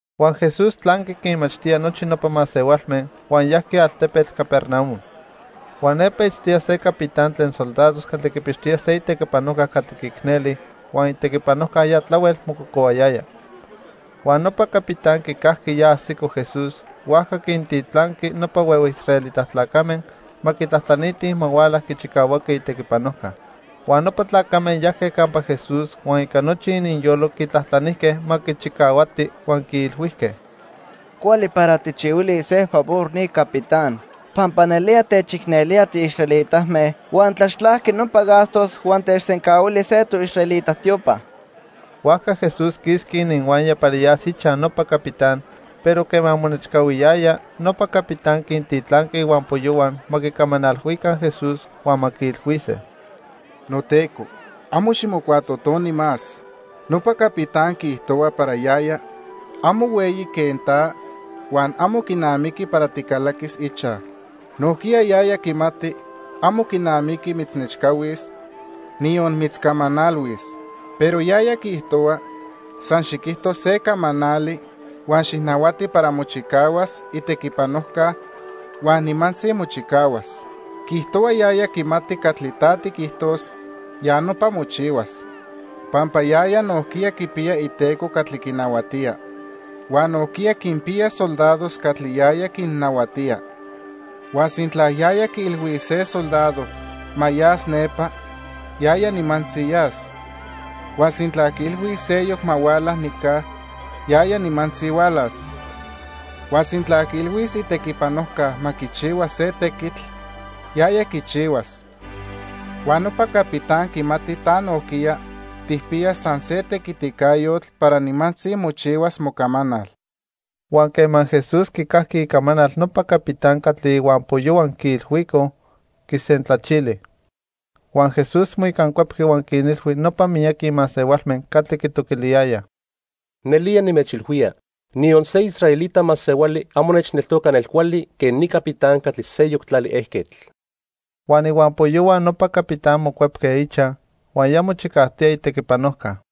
Huan Jesús tlanqui quinmachtía nochi nopa masehualme, huan yajqui altepetl Capernaum. Huan nepa itztoya se capitán tlen soldados catli quipixtoya se itequipanojca catli quiicneli, huan itequipanojca ya tlahuel mococohuayaya. Huan nopa capitán quicajqui ya ajsico Jesús, huajca quintitlanqui nopa huehue israelita tlacame ma quitlajtlanitij ma huala quichicahuaqui itequipanojca. Huan nopa tlacame yajque campa Jesús huan ica nochi ininyolo quitlajtlanijque ma quichicahuati huan quiilhuijque: —Cuali para tijchihuilis se favor ni capitán, pampa nelía techicnelía tiisraelitame huan tlaxtlajqui nopa gastos huan techsencahuili se toisraelita tiopa. Huajca Jesús quisqui ininhuaya para yas ichaj nopa capitán, pero quema monechcahuiyaya, nopa capitán quintitlanqui ihuampoyohua ma quicamanalhuica Jesús huan ma quiilhuise: —NoTeco, amo ximocuatotoni más. Nopa capitán quiijtohua para yaya amo hueyi quen ta, huan amo quinamiqui para ticalaquis ichaj. Nojquiya yaya quimati amo quinamiqui mitznechcahuis, niyon mitzcamanalhuis. Pero yaya quiijtohua, san xiquijto se camanali huan xijnahuati para mochicahuas itequipanojca huan nimantzi mochicahuas. Quiijtohua yaya quimati catli ta tiquijtos, ya nopa mochihuas, pampa yaya nojquiya quipiya iteco catli quinahuatía. Huan nojquiya quinpiya soldados catli yaya quinnahuatía. Huan sintla yaya quiilhuis se soldado ma yas nepa, yaya nimantzi yas. Huan sintla quiilhuis seyoc ma huala nica, yaya nimantzi hualas. Huan sintla quiilhuis itequipanojca ma quichihua se tequitl, yaya quichihuas. Huan nopa capitán quimati ta nojquiya tijpiya san se tequiticayotl para nimantzi mochihuas mocamanal. Huan quema Jesús quicajqui icamanal nopa capitán catli ihuampoyohua quiilhuicoj, quisentlachili. Huan Jesús moicancuepqui huan quinilhui nopa miyaqui masehualme catli quitoquiliyayaj: —Nelía nimechilhuía, niyon se israelita masehuali amo nechneltoca nelcuali quen ni capitán catli seyoc tlali ejquetl. Huan ihuampoyohua nopa capitán mocuepque ichaj, huan ya mochicajtoya itequipanojca.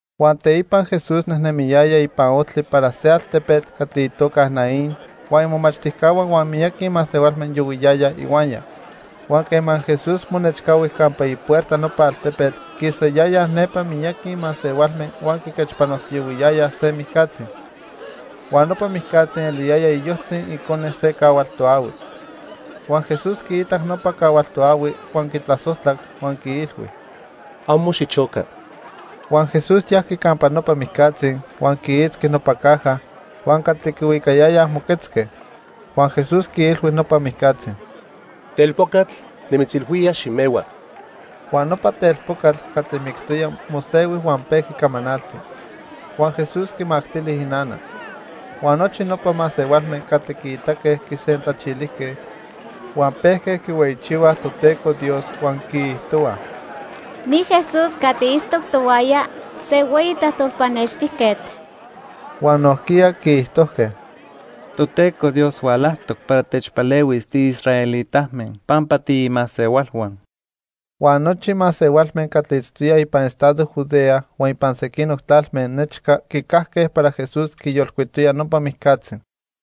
Huan teipa Jesús nejnemiyaya ipan ojtli para se altepetl catli itoca Naín huan imomachtijcahua huan miyaqui masehualme yohuiyayaj ihuaya. Huan quema Jesús monechcahui campa ipuerta nopa altepetl, quisayayaj nepa miyaqui masehualme huan quiquechpanojtiyohuiyayaj se mijcatzi. Huan nopa mijcatzi eliyaya iyojtzi icone se cahual toahui. Huan Jesús quiitac nopa cahual toahui, huan quitlasojtlac huan quiilhui: —Amo xichoca. Huan Jesús yajqui campa nopa mijcatzi, huan quiitzqui nopa caja; huan catli quihuicayayaj moquetzque. Huan Jesús quiilhui nopa mijcatzi: —Telpocatl, nimitzilhuía, ximehua. Huan nopa telpocatl catli mictoya mosehui huan pejqui camanalti. Huan Jesús quimactili inana. Huan nochi nopa masehualme catli quiitaque quisentlachilijque, huan pejque quihueyichihuaj Toteco Dios huan quiijtohuaj: —Ni Jesús catli itztoc tohuaya, se hueyi tlajtol pannextijquetl. Huan nojquiya quiijtojque: —Toteco Dios hualajtoc para techpalehuis tiisraelitame pampa tiimasehualhua. Huan nochi masehualme catli itztoyaj ipan estado Judea huan ipan sequinoc tlalme nechca quicajque para Jesús quiyolcuitoya nopa mijcatzi.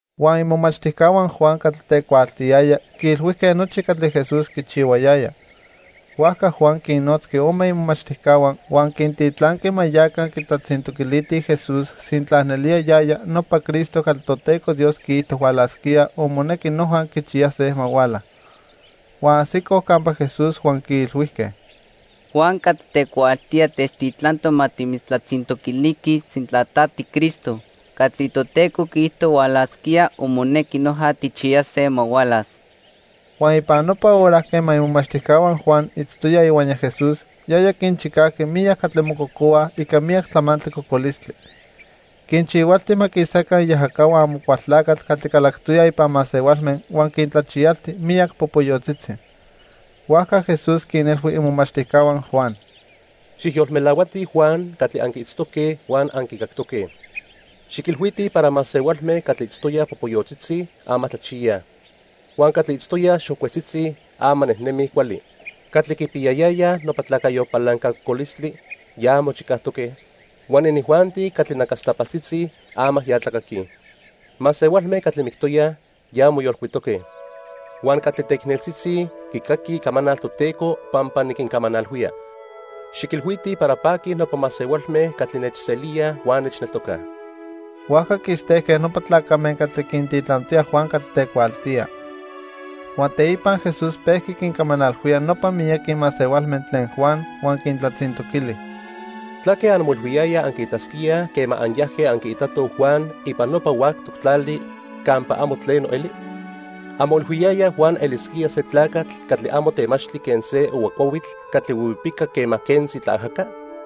Huan imomachtijcahua Juan catli tecuaaltiyaya quiilhuijque nochi catli Jesús quichihuayaya. Huajca Juan quinnotzqui ome imomachtijcahua, huan quintitlanqui ma yaca quitlatzintoquilitij Jesús sintla nelía yaya nopa Cristo catli Toteco Dios quiijto hualasquía o monequi noja quichiyase ma huala. Huan ajsicoj campa Jesús huan quiilhuijque: —Juan catli tecuaaltía techtitlantoc ma timitztlatzintoquiliquij sintla ta tiCristo catli Toteco quiijto hualasquía o monequi noja tijchiyase ma hualas. Huan ipan nopa hora quema imomachtijcahua Juan itztoyaj ihuaya Jesús, yaya quinchicajqui miyac catli mococohuaj ica miyac tlamantli cocolistli. Quinchihualti ma quisaca iajacahua Amocualtlacatl catli calactoyaj ipan masehualme huan quintlachiyalti miyac popoyotzitzi. Huajca Jesús quinilhui imomachtijcahua Juan: —Xijyolmelahuatij Juan catli anquiitztoque huan anquicactoque. Xiquilhuitij para masehualme catli itztoyaj popoyotzitzi, ama tlachiyaj. Huan catli itztoyaj xocuetzitzi, ama nejnemij cuali. Catli quipiyayayaj nopa tlacayo palanca cocolistli, ya mochicajtoque, huan inijuanti catli nacastapaltzitzi, ama ya tlacaquij. Masehualme catli mictoyaj, ya moyolcuitoque; huan catli teicneltzitzi quicaquij icamanal Toteco pampa niquincamanalhuía. Xiquilhuitij para paquij nopa masehualme catli nechselíaj huan nechneltocaj. Huajca quistejque nopa tlacame catli quintitlantoya Juan catli tecuaaltía. Huan teipa Jesús pejqui quincamanalhuía nopa miyaqui masehualme tlen Juan huan quintlatzintoquili: "¿Tlaque anmoilhuiyayaj anquiitasquíaj quema anyajque anquiitatoj Juan ipan nopa huactoc tlali campa amo tleno eli? ¿Anmoilhuiyayaj Juan elisquía se tlacatl catli amo temachtli quen se ohua cuahuitl catli huihuipica quema quentzi tlaajaca?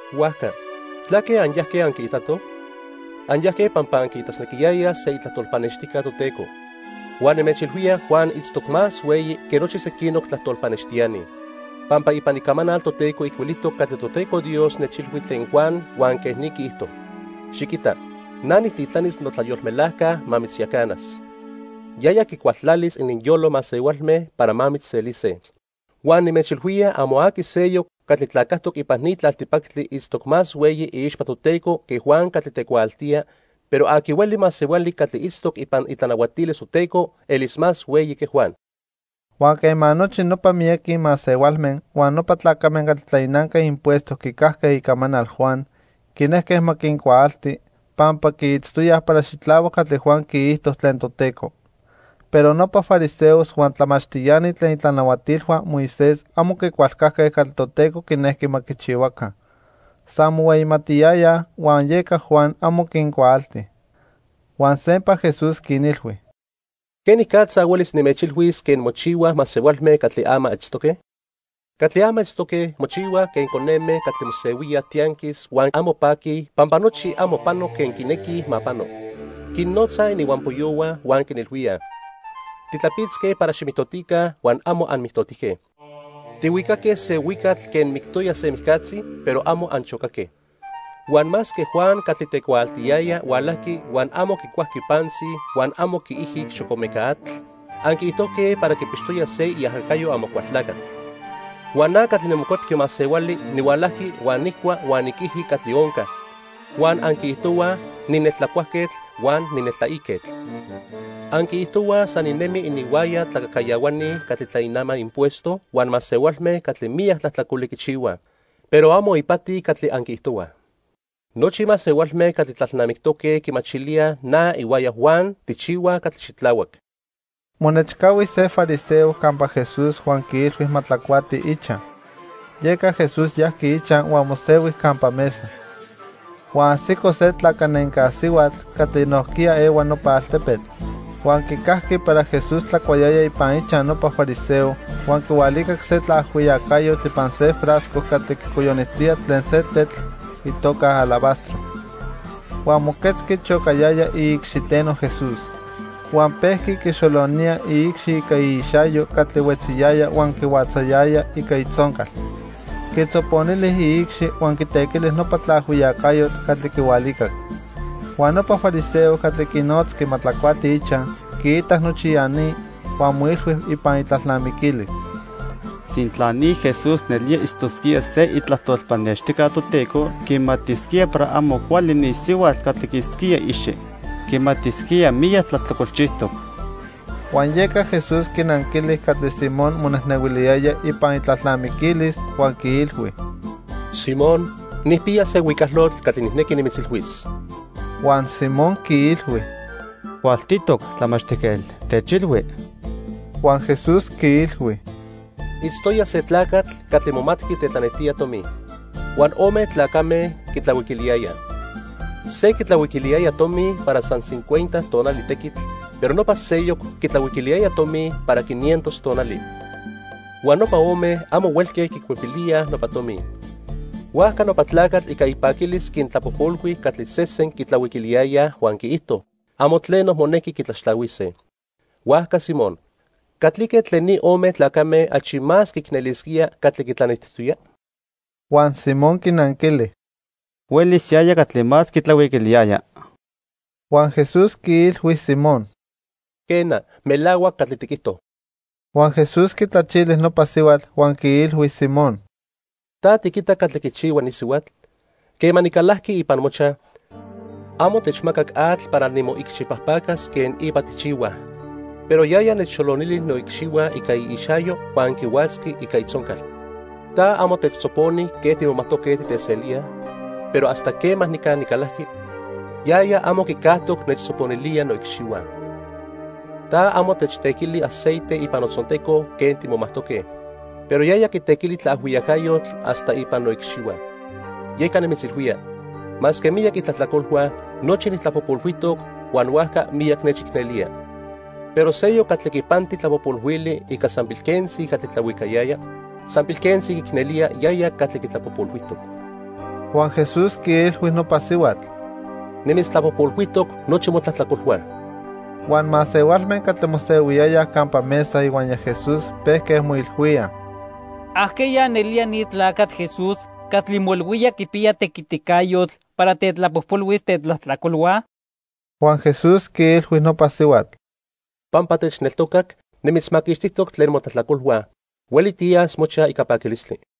Huajca, ¿tlaque anyajque anquiitatoj? Anyajque pampa anquiitasnequiyayaj se itlajtol pannextijca Toteco. Huan nimechilhuía Juan itztoc más hueyi que nochi sequinoc tlajtol pannextiani, pampa ipan Icamanal Toteco ijcuilijtoc catli Toteco Dios nechilhui tlen Juan huan quej ni quiijto: 'Xiquita, na nijtitlanis notlayolmelajca ma mitzyacanas. Yaya quicualtlalis ininyolo masehualme para ma mitzselise.' Huan nimechilhuía amo aqui seyoc catli tlacajtoc ipan ni tlaltipactli itztoc más hueyi iixpa Toteco que Juan catli tecuaaltía, pero aqui hueli masehuali catli itztoc ipan itlanahuatilis Toteco elis más hueyi que Juan." Huan quema nochi nopa miyaqui masehualme huan nopa tlacame catli tlainanque impuesto quicajque icamanal Juan, quinejque ma quincuaalti, pampa quiitztoyaj para xitlahuac catli Juan quiijto tlen Toteco. Pero nopa fariseos huan tlamachtiani tlen itlanahuatilhua Moisés amo quicualcajque catli Toteco quinejqui ma quichihuaca. San mohueyimatiyayaj, huan yeca Juan amo quincuaalti. Huan sempa Jesús quinilhui: "¿Quenicatza huelis nimechilhuis quen mochihuaj masehualme catli ama itztoque? Catli ama itztoque mochihuaj quen coneme catli mosehuíaj tianquis huan amo paquij pampa nochi amo pano quen quinequij ma pano. Quinnotzaj ininhuampoyohua huan quinilhuíaj: 'Titlapitzque para ximijtotica, huan amo anmijtotijque. Tihuicaque se huicatl quen mictoya se mijcatzi, pero amo anchocaque.' Huan masque Juan catli tecuaaltiyaya hualajqui huan amo quicuajqui pantzi huan amo quiijic xocomeca atl, anquiijtojque para quipixtoya se iajacayo Amocualtlacatl. Huan na catli niMocuepqui Masehuali nihualajqui huan nijcua huan niquiji catli onca, huan anquiijtohuaj nineltlacuajquetl huan nineltlaiquetl. Anquiijtohuaj san ninemi ininhuaya tlacajcayahuani catli tlainamaj impuesto huan masehualme catli miyac tlajtlacoli quichihuaj. Pero amo ipati catli anquiijtohuaj. Nochi masehualme catli tlalnamictoque quimachilíaj na ihuaya Juan tijchihuaj catli xitlahuac." Monechcahui se fariseo campa Jesús huan quiilhui ma tlacuati ichaj. Yeca Jesús yajqui ichaj huan mosehui campa mesa. Huan ajsico se tlacanenca sihuatl catli nojquiya ehua nopa altepetl. Huan quicajqui para Jesús tlacuayaya ipan ichaj nopa fariseo huan quihualicac se tlaajhuiyacayotl ipan se frasco catli quicoyonijtoya tlen se tetl itoca alabastro. Huan moquetzqui chocayaya iicxiteno Jesús. Huan pejqui quixolonía iicxi ica iixayo catli huetziyaya huan quihuatzayaya ica itzoncal. Quitzoponili iicxi huan quitequili nopa tlaajhuiyacayotl catli quihualicac. Huan nopa fariseo catli quinotzqui ma tlacuati ichaj quiitac nochi ya ni, huan moilhui ipan itlalnamiquilis: "Sintla ni Jesús nelía itztosquía se itlajtol pannextijca Toteco, quimatisquía para amo cuali ni sihuatl catli quiitzquía iicxi. Quimatisquía miyac tlajtlacolchijtoc." Huan yeca Jesús quinanquili catli Simón monejnehuiliyaya ipan itlalnamiquilis huan quiilhui: —Simón, nijpiya se huicalotl catli nijnequi nimitzilhuis. Huan Simón quiilhui: —Cualtitoc, Tlamachtijquetl, techilhui. Huan Jesús quiilhui: —Itztoya se tlacatl catli momatqui tetlanejtía tomi. Huan ome tlacame quitlahuiquiliyayaj. Se quitlahuiquiliyaya tomi para san cincuenta tonali tequitl, pero nopa seyoc quitlahuiquiliyaya tomi para quinientos tonali. Huan nopa ome amo huelque quicuepilíaj nopa tomi. Huajca nopa tlacatl ica ipaquilis quintlapojpolhui catli sesen quitlahuiquiliyayaj huan quiijto amo tleno monequi quitlaxtlahuise. Huajca Simón, ¿catlique tlen ni ome tlacame achi más quiicnelisquía catli quintlanejtijtoya? Huan Simón quinanquili: —Huelis yaya catli más quitlahuiquiliyaya. Huan Jesús quiilhui Simón: —Quena, melahuac catli tiquijto. Huan Jesús quitlachili nopa sihuatl huan quiilhui Simón: —¿Ta tiquita catli quichihua ni sihuatl? Quema nicalajqui ipan mochaj, amo techmacac atl para nimoicxipajpacas quen ipa tijchihuaj, pero yaya nechxolonili noicxihua ica iixayo huan quihuatzqui ica itzoncal. Ta amo techtzoponi quen timomajtoque titeselíaj, pero hasta quema nica nicalajqui, yaya amo quicajtoc nechtzoponilía noicxihua. Ta amo techtequili aceite ipan notzonteco quen timomajtoque, pero yaya quitequili tlaajhuiyacayotl hasta ipan noicxihua. Yeca nimitzilhuía, masque miyac itlajtlacolhua, nochi nijtlapojpolhuijtoc huan huajca miyac nechicnelía. Pero seyoc catli quipanti tlapojpolhuili ica san pilquentzi catli tlahuicayaya, san pilquentzi quiicnelía yaya catli quitlapojpolhuijtoc. Huan Jesús quiilhui nopa sihuatl: —Nimitztlapojpolhuijtoc nochi motlajtlacolhua. Huan masehualme catli mosehuiyayaj campa mesa ihuaya Jesús pejque moilhuíaj: —¿Ajqueya nelía ni tlacatl Jesús catli moilhuía quipiya tequiticayotl para tetlapojpolhuis tetlajtlacolhua? Huan Jesús quiilhui nopa sihuatl: —Pampa techneltocac, nimitzmaquixtijtoc tlen motlajtlacolhua. Hueli tiyas mochaj ica paquilistli.